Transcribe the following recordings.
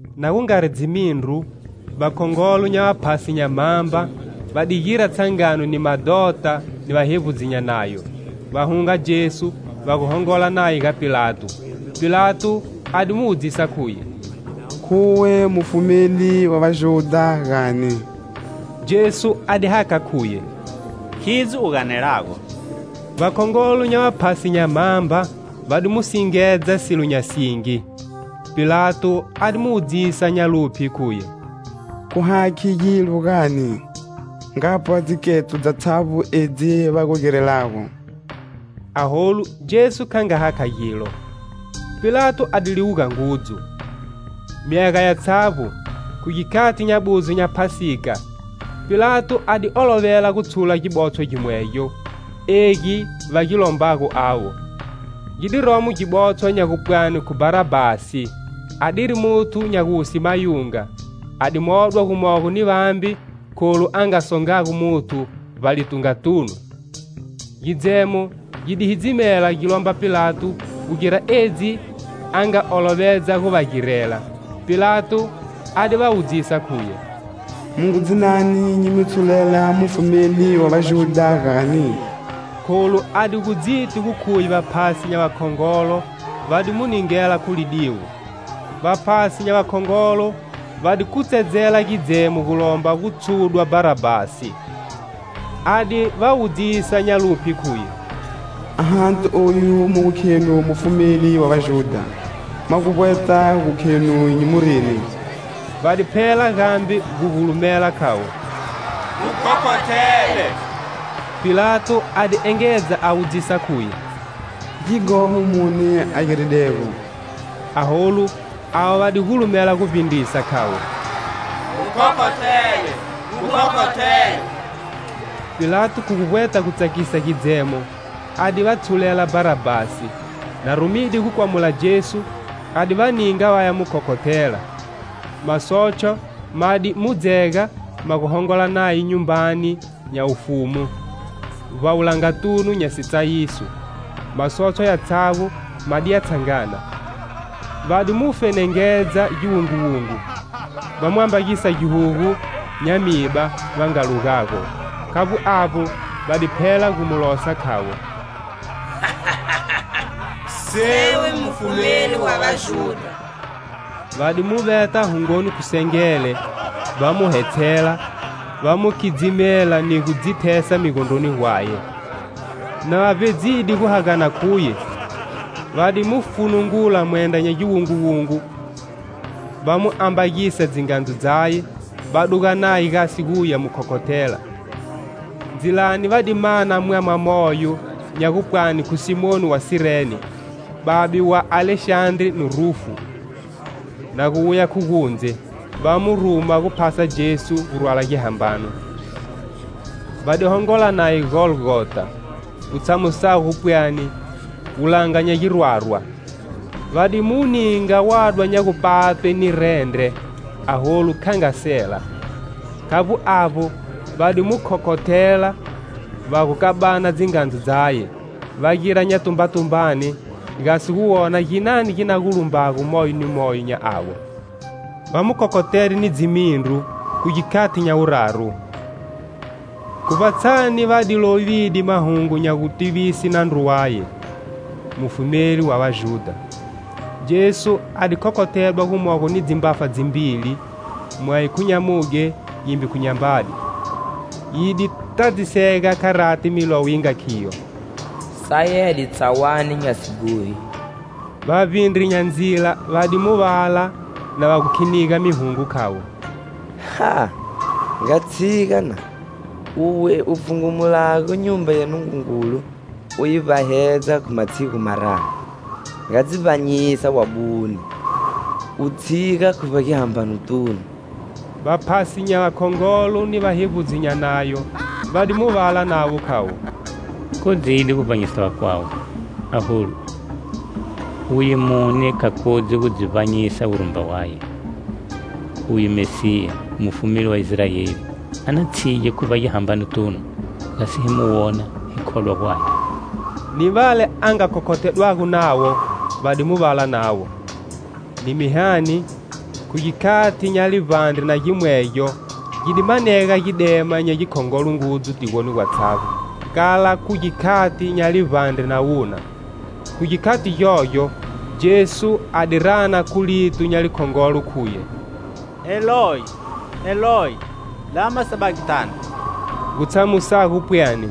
Na gu ngari dzimindru, vakhongolo nya vaphasi nya mhamba va di gira tshangano ni madhota ni vahevbudzi nya Nayo, va hunga Jesu va gu hongola naye ga Pilato. Pilato a di mu wudzisa khuye: "Khuwe Mufumeli wa Vajudha, gani?" Jesu a di hakha khuye: "Khidzo u ganelago." Vakhongolo nya vaphasi nya mhamba va di mu singedza silo nya singi. Pilato a di mu wudzisa nya luphye, khuye: "Khu hakhi gilo, gani? Ngapwa dziketso dzatshavbo edzi va gu girelago!" Aholu Jesu kha nga hakha gilo. Pilato a di liwuga ngudzu. Myaga yatshavbo, khu gikhati nya buzo nya Phasika, Pilato a di olovela gu tshula gibotshwa gimwegyo, egi va gi lombago avo. Gi di romo gibotshwa nya gupwani khu Bharabhasi, adiri muthu nya guwuse mayunga, a di modwa gumogo ni vambe kholu a nga songago muthu vbalitungatunu. Gidzemo gi di hidzimela gi lomba Pilato gu gira edzi a nga olovedza gu va girela. Pilato a di va wudzisa khuye: "Mu ngu dzinani nyi mi tshulela Mufumeli wa Vajudha, gani?" Kholu a di gu dziti gu khuye vaphasi nya vakhongolo va di mu ningela khu lidiwo. Vaphasi nya vakhongolo va di kutsedzela gidzemo gu lomba gu tshudwa Bharabhasi. A di va wudzisa nya luphye khuye: "Ahati oyu mu gu khenu Mufumeli wa Vajudha, mwa gu vbweta gu khenu nyi mu rini?" Va di phela gambe gu gulumela khavo: "Mu khokhothele!" Pilato a di engedza a wudzisa khuye: "Gighoho muni a giridego?" Aholu avo va di gulumela gu vbindrisa, khavo: "Mu khokhothele! Mu khokhothele!" Pilato khu gu vbweta gu tsakisa gidzemo, a di va tshulela Bharabhasi, na rumide gu kwamula Jesu, a di va ninga vaya mu khokhothela. Masotshwa ma di mu dzega ma gu hongola naye nyumbani nya wufumu, vbawulangatunu nya sitsayiso. Masotshwa yatshavbo ma diya tshangana. Va di mu fenengedza giwunguwungu, va mu ambagisa gihugu nya miba va nga lugago. Khavbo avbo, va di phela gu mu losa khavo: "Sewe, Mufumeli wa Vajudha!" Va di mu veta hungoni khu sengele, va mu hetshela, va mu khidzimela ni gu dzi thesa migondroni gwaye. Na va vbedzide gu hagana khuye, va di mu funungula mwendra nya giwunguwungu, va mu ambagisa dzingandzu dzaye, va duga naye gasi guya mu khokhothela. Ndzilani va di mana mwama moyo nya gupwani khu Simoni wa Sirene, babe wa Alexandre ni Rufu, na gu wuya khu gundze, va mu ruma guphasa Jesu gu rwala gihambano. Va di hongola naye Golgota, gutshamusago gu pwani "Wulanga nya girwarwa." Va di mu ninga wadwa nya gupatwe ni rendre, aholu, kha nga sela. Khavbo avbo, va di mu khokhothela, va gu kabana dzingandzu dzaye, va gira nyatumbatumbane gasi gu wona ginani gi na gu lumbago moyo ni moyo nya avo. Va mu khokhothede ni dzimindru, khu gikhati nya wuraru. Khu vbatshani va di lovide mahungu nya gutivise nandru waye: "Mufumeli wa Vajudha." Jesu a di khokhothedwa gumogo ni dzimbafa dzimbili, mweyo khu nyamudye, yimbe khu nyambade. [ Yi di tadzisega kharati Milowo yi nga khiyo: "Sayedwe tsawani nya sighohi."] Vavbindri nya ndzila va di mu vala na va gu khiniga mihungo, khavo: "Ah! Nga tshiga, na! Uwe u pfhungumulago Nyumba ya Nungungulu u yi vbahedza khu matshigu mararu! Nga dzi vbanyisa wabune u tshiga khu vbagihambanotunu." Vaphasi nya vakhongolo ni vahevbudzi nya Nayo va di mu vala navo khavo: "Kodzide gu vbanyisa vakwawe, aholu, uye mune kha kodzi gu dzi vbanyisa wurumba waye! Uye Mesiya, Mufumeli wa Israeli, a na tshige khu vbagihambanotunu, gasi hi mu wona, hi khodwa gwaye." Ni vale a nga khokhothedwago navo, va di mu vala navo. Ni mihani, khu gikhati nya livbandre na gimwegyo gi di manega gidema nya gikhongolo ngudzu tigoni gwatshavbo, kala khu gikhati nya livbandre na wuna. Khu gikhati gyogyo, Jesu a di rana khu lito nya likhongolo khuye: "Eloyi, Eloyi, lama sabaktani?" Gu tshamusago pwani: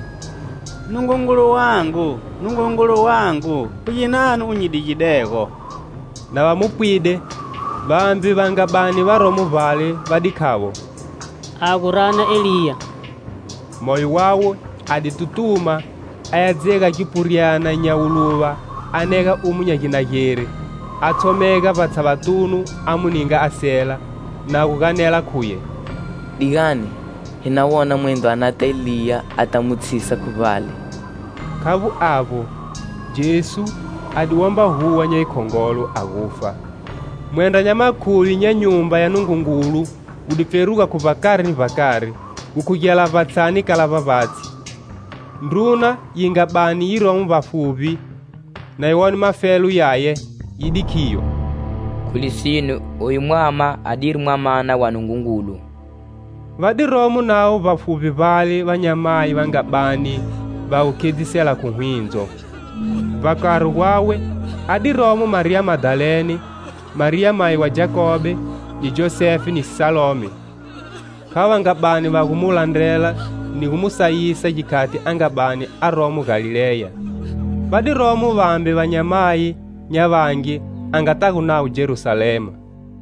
"Nungungulu wangu, Nungungulu wangu, khu ginani u nyi digidego?" Na va mu pwide, vambe va nga bani varomo vbale, va di khavo: "A gu rana Eliya!" Moyo wawe, a di tutuma, aya dzega gipuryana nya wuluva a nega omu nya ginageri, a tshomega vbatshavatunu a mu ninga a sela, na gu ganela khuye: "Digani, hi na wona mwendro a nata Eliya a ta mu tshisa khu vbale." Khavbo avbo, Jesu, a di womba huwa nya yikhongolo, a gufa. Mwendra nya makhuvi nya Nyumba ya Nungungulu wu di pferuga khu vbakari ni vbakari, gu khugela vbatshani kala vbavbatshi. Ndruna yi nga bani yiromo vbafuvbi, na yi wone mafelo yaye, yi di khiyo: "Khu lisine, oyu mwama adiri Mwamana wa Nungungulu!" Va di romo navo vbafuvbi vbale vanyamayi va nga bani va gu khedzisela khu hwindzo. Vbakari gwawe a di romo Mariya Madalene, Mariya mayi wa Jakobe, ni Josefe ni Salome. Khavo va nga bani va gu mu landrela ni gu mu sayisa gikhati a nga bani aromo Galileya. Va di romo vambe vanyamayi nya vangi a ngatago navo Jerusalema.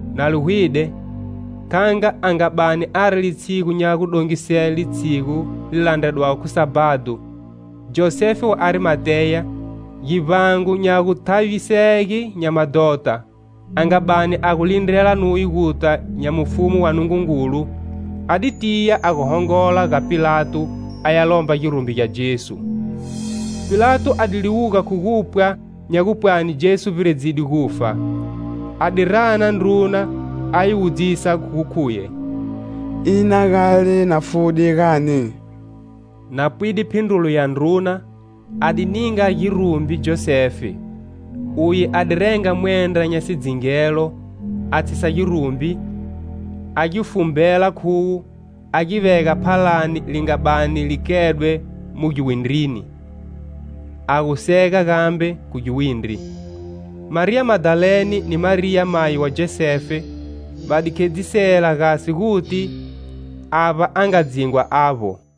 Na li hwide, kha nga a nga bani ari litshigu nya gu dongisele, litshigu li landredwago khu Sabhado. Josefe wa Arimateya, givbango nya guthavisege nya madhota, a nga bani a gu lindrela nuye guta nya mufumu wa Nungungulu, a di tiya a gu hongola ga Pilato aya lomba girumbi gya Jesu. Pilato a di liwuga khu gupwa nya gupwani Jesu vbiredzede gufa, a di rana ndruna a yi wudzisa gu khuye: "Ina gale na fude, gani?" Na pwide phindrulo ya ndruna, a di ninga girumbi Josefe. Uye a di renga mwendra nya sidzingelo, a tshisa girumbi, a gi fumbela khuwo, a gi vega phalani li nga bani li kedwe mu giwindrini, a gu sega gambe khu giwindri. Mariya Madalene ni Mariya mayi wa Josefe, va di khedzisela gasi gu guti avba a nga dzingwa avbo.